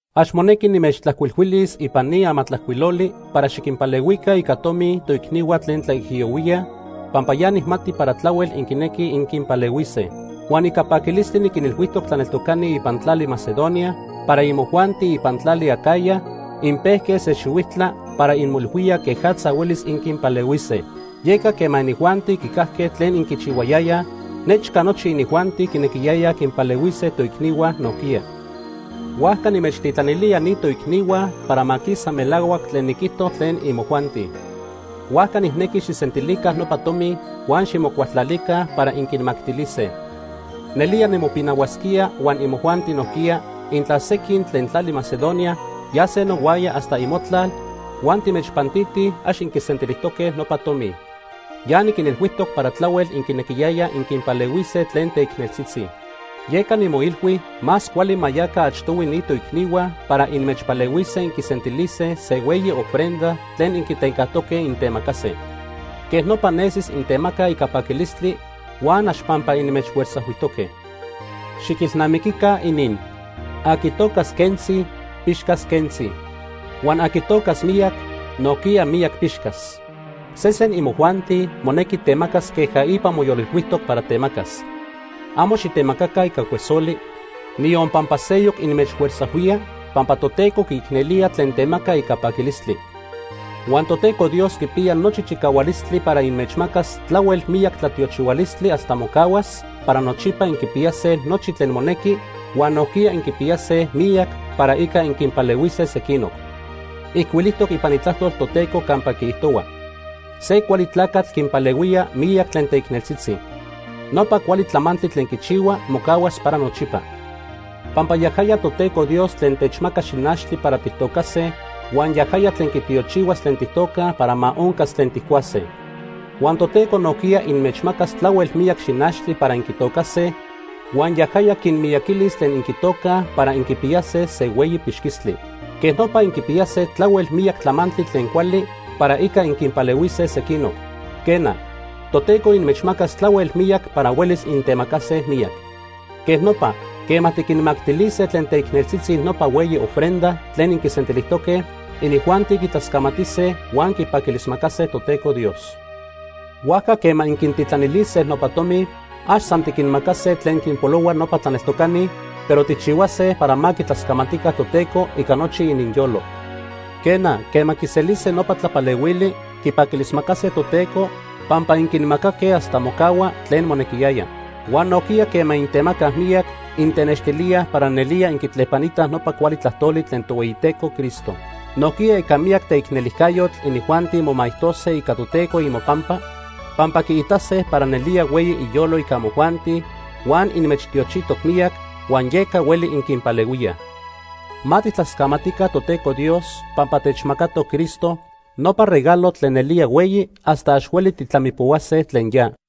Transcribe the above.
Ax monequi nimechtlajcuilhuilis ipan ni amatlajcuiloli para xiquinpalehuica ica tomi toicnihua tlen tlaijiyohuíaj, pampa ya nijmati para tlahuel inquinequij inquinpalehuise. Huan ica paquilistli niquinilhuijtoc tlaneltocani ipan tlali Macedonia para imojuanti ipan tlali Acaya inpejque se xihuijtla para inmoilhuíaj quejatza huelis inquinpalehuise. Yeca quema inijuanti quicajque tlen inquichihuayayaj, nechca nochi inijuanti quinequiyayaj quinpalehuise toicnihua nojquiya. Huajca nimechtitlanilía ni toicnihua para ma quisa melahuac tlen niquijto tlen imojuanti. Huajca nijnequi xijsentilica nopa tomi huan ximocualtlalica para inquinmactilise. Nelía nimopinahuasquía huan imojuanti nojquiya, intla sequin tlen tlali Macedonia yase nohuaya hasta imotlal huan timechpantitij ax inquisentilijtoque nopa tomi. Ya niquinilhuijtoc para tlahuel inquinequiyayaj inquinpalehuise tlen teicneltzitzi. Yeca nimoilhui más cuali ma yaca achtohui ni toicnihua para inmechpalehuise inquisentilise se hueyi ofrenda tlen inquitencajtoque intemacase. Quej nopa nesis intemacaj ica paquilistli huan ax pampa inmechfuerzajhuijtoque. Xiquilnamiquica inin: Aqui tocas quentzi, pixcas quentzi. Huan aqui tocas miyac, nojquiya miyac pixcas. Sesen imojuanti monequi temacas queja ipa moyolilhuijtoc para temacas. Amo xitemacaca ica cuesoli, niyon pampa seyoc inmechfuerzajhuía, pampa Toteco quiicnelía tlen temaca ica paquilistli. Huan Toteco Dios quipiya nochi chicahualistli para inmechmacas tlahuel miyac tlatiochihualistli hasta mocahuas para nochipa inquipiyase nochi tlen monequi, huan nojquiya inquipiyase miyac para ica inquinpalehuise sequinoc. Ijcuilijtoc ipan Itlajtol Toteco campa quiijtohua: “Se cuali tlacatl quinpalehuía miyac tlen teicneltzitzi. Nopa cuali tlamantli tlen quichihua mocahuas para nochipa.” Pampa yajaya Toteco Dios tlen techmaca xinachtli para tijtocase huan yajaya tlen quitiochihuas tlen tijtocaj para ma oncas tlen tijcuase. Huan Toteco nojquiya inmechmacas tlahuel miyac xinachtli para inquitocase huan yajaya quinmiyaquilis tlen inquitocaj para inquipiyase se hueyi pixquistli. Quej nopa inquipiyase tlahuel miyac tlamantli tlen cuali para ica inquinpalehuise sequinoc. Quena, Toteco inmechmacas tlahuel miyac para huelis intemacase miyac. Quej nopa, quema tiquinmactilise tlen teicneltzitzi nopa hueyi ofrenda tlen inquisentilijtoque, inijuanti quitlascamatise huan quipaquilismacase Toteco Dios. Huajca quema inquintitlanilise nopa tomi, ax san tiquinmacase tlen quinpolohua nopa tlaneltocani, pero tijchihuase para ma quitlascamatica Toteco ica nochi ininyolo. Quena, quema quiselise nopa tlapalehuili, quipaquilismacase Toteco pampa inquinmacaque hasta mocahua tlen monequiyaya. Huan nojquiya quema intemacaj miyac, intenextilíaj para nelía inquitlepanitaj nopa cuali tlajtoli tlen Tohueyiteco Cristo. Nojquiya ica miyac teicnelijcayotl inijuanti momaijtose ica Toteco imopampa, pampa quiitase para nelía hueyi iyolo ica imojuanti huan inmechtiochijtoc miyac, huan yeca hueli inquinpalehuíaj. Ma tijtlascamatica Toteco Dios pampa techmacatoc Cristo, nopa regalo tlen nelía hueyi hasta ax hueli tijtlamipohuase tlen ya.